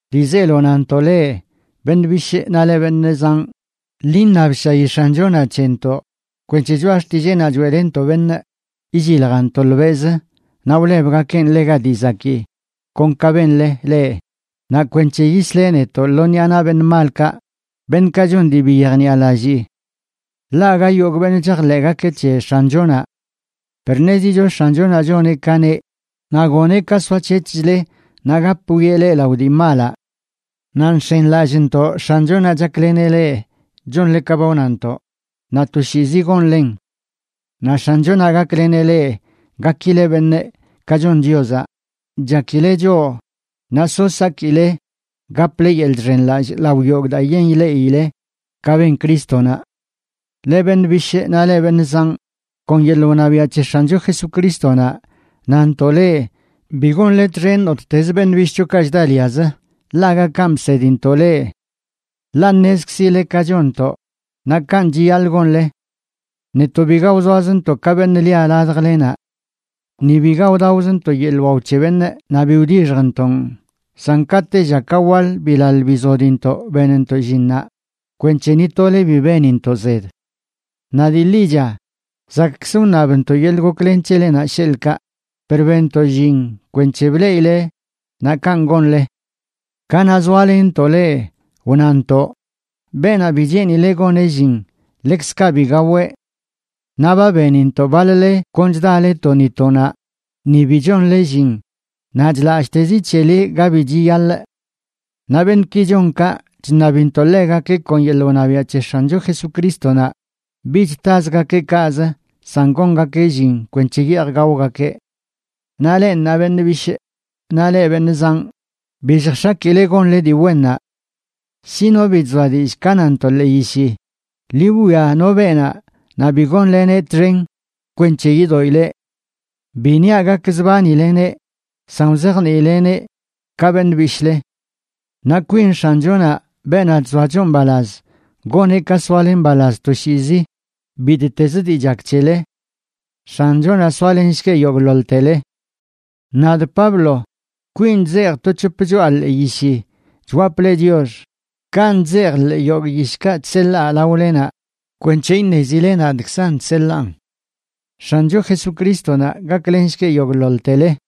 Dii zeelo nantoꞌ leꞌ, beṉꞌ bishꞌ naꞌ leꞌ, beṉꞌ zanꞌ, ḻi iṉabshayi X̱anchonaꞌ c̱hentoꞌ kwenc̱he choꞌa xtilleenaꞌ choeꞌlenntoꞌ beṉꞌ illiljan tolbeꞌzə naꞌ wlebgakeꞌn ḻega dii zakii, kon ka benle leꞌ, naꞌ kwenc̱he yisleꞌ netoꞌ lo ṉiꞌa naꞌ beṉꞌ malkaꞌ, beṉꞌkaꞌ chon dii bi yejniꞌalallii. Ḻaꞌ aga yogꞌ beṉꞌ chajḻeꞌgakeꞌ c̱he X̱anchonaꞌ. Per ṉezicho X̱anchonaꞌ choneꞌ ka neꞌ, naꞌ goneꞌ ka soac̱hec̱hchle naꞌ gap wwieꞌ leꞌ lao dii malaꞌ. Naꞌ nx̱enlallꞌntoꞌ X̱anchonaꞌ chakleneꞌ leꞌ chonle ka ba wnantoꞌ, naꞌ toshiizi gonlen. Naꞌ X̱anchonaꞌ gakleneꞌ leꞌ gakileꞌ beṉꞌ, ka chon Chiozaꞌ chakileꞌ choꞌ, naꞌ so sakile gaple yeḻꞌ chxenlallꞌ lao yogꞌ daa yen ileꞌile ka ben Crístonaꞌ. Leꞌ beṉꞌ bishꞌ naꞌ leꞌ beṉꞌ zanꞌ, kon yeḻꞌ wṉabiaꞌ c̱he X̱ancho Jesucrístonaꞌ nantoꞌ leꞌ bi gonle txen nottezə beṉꞌ bishꞌchokaꞌ chdaliazə, ḻaꞌ aga kanꞌ bsedintoꞌ leꞌ. Ḻaꞌ ṉezkzile ka chonntoꞌ, naꞌ kanꞌ chiyaḻꞌ gonle. Netoꞌ biga wzoazntoꞌ ka beṉꞌ lia ladjlenaꞌ. Ni biga wdaozntoꞌ yeḻꞌ wao c̱he beṉꞌ naꞌ bi wdixjntoꞌn, san ka tella ka waḻ bilaḻ bizodintoꞌ benntoꞌ llinnaꞌ kwenc̱he ni tole bi benintoꞌ zed. Naꞌ dii ḻicha, zakꞌkzə wṉabntoꞌ yeḻꞌ goklen c̱helenaꞌ, sheḻꞌkaꞌ, per benntoꞌ llin kweṉche bleꞌile, naꞌ kanꞌ gonle. Kanaꞌ zoalenntoꞌ leꞌ wnantoꞌ: “Beenaꞌ bi cheenileꞌ goneꞌ llin, ḻekzkaꞌ bi gaweꞌ.” Naꞌ ba benintoꞌ baḻ-le kon chdale to ni to naꞌ, ni bi chonle llin, naꞌ chlalltezi c̱hele ga bi chiyaḻꞌ. Naꞌ beṉꞌki chon kaꞌ, chṉabintoꞌ ḻegakeꞌ kon yeḻꞌ wṉabiaꞌ c̱he X̱ancho Jesucrístonaꞌ bich tazgakeꞌ kaꞌz, san gongakeꞌ llin kwenc̱he yeej gaogakeꞌ. Naꞌ leꞌ ṉaa beṉꞌ bishꞌ, naꞌ leꞌ beṉꞌ zanꞌ, bi lljx̱akile gonle dii wennaꞌ. Shi no bi chzoa dillꞌ ka nantoꞌ ḻee yishi, ḻi wwia no beenaꞌ naꞌ bi gonleneꞌ txen kwenc̱he yidoꞌileꞌ. Bi niaꞌ gakzbanileneꞌ, san wzajniileꞌneꞌ ka beṉꞌ bishꞌle. Naꞌ kwin X̱anchonaꞌ, beenaꞌ chzoa choꞌ mbalaz, goneꞌ ka soale mbalaz toshiizi bittezə dii chak c̱hele. X̱anchonaꞌ soalenshgueꞌ yogꞌḻoḻtele. Nadꞌ Pablo, kwinꞌ chzejꞌa to c̱hop choꞌa ḻee yishi chwapꞌ leꞌ chiox, kanꞌ chzejꞌ ḻee yogꞌ yishkaꞌ chseḻaa laolenaꞌ kwenc̱he iṉezile nadꞌkzan chseḻaan. X̱ancho Jesucrístonaꞌ gaklenshgueꞌ yogꞌḻoḻtele.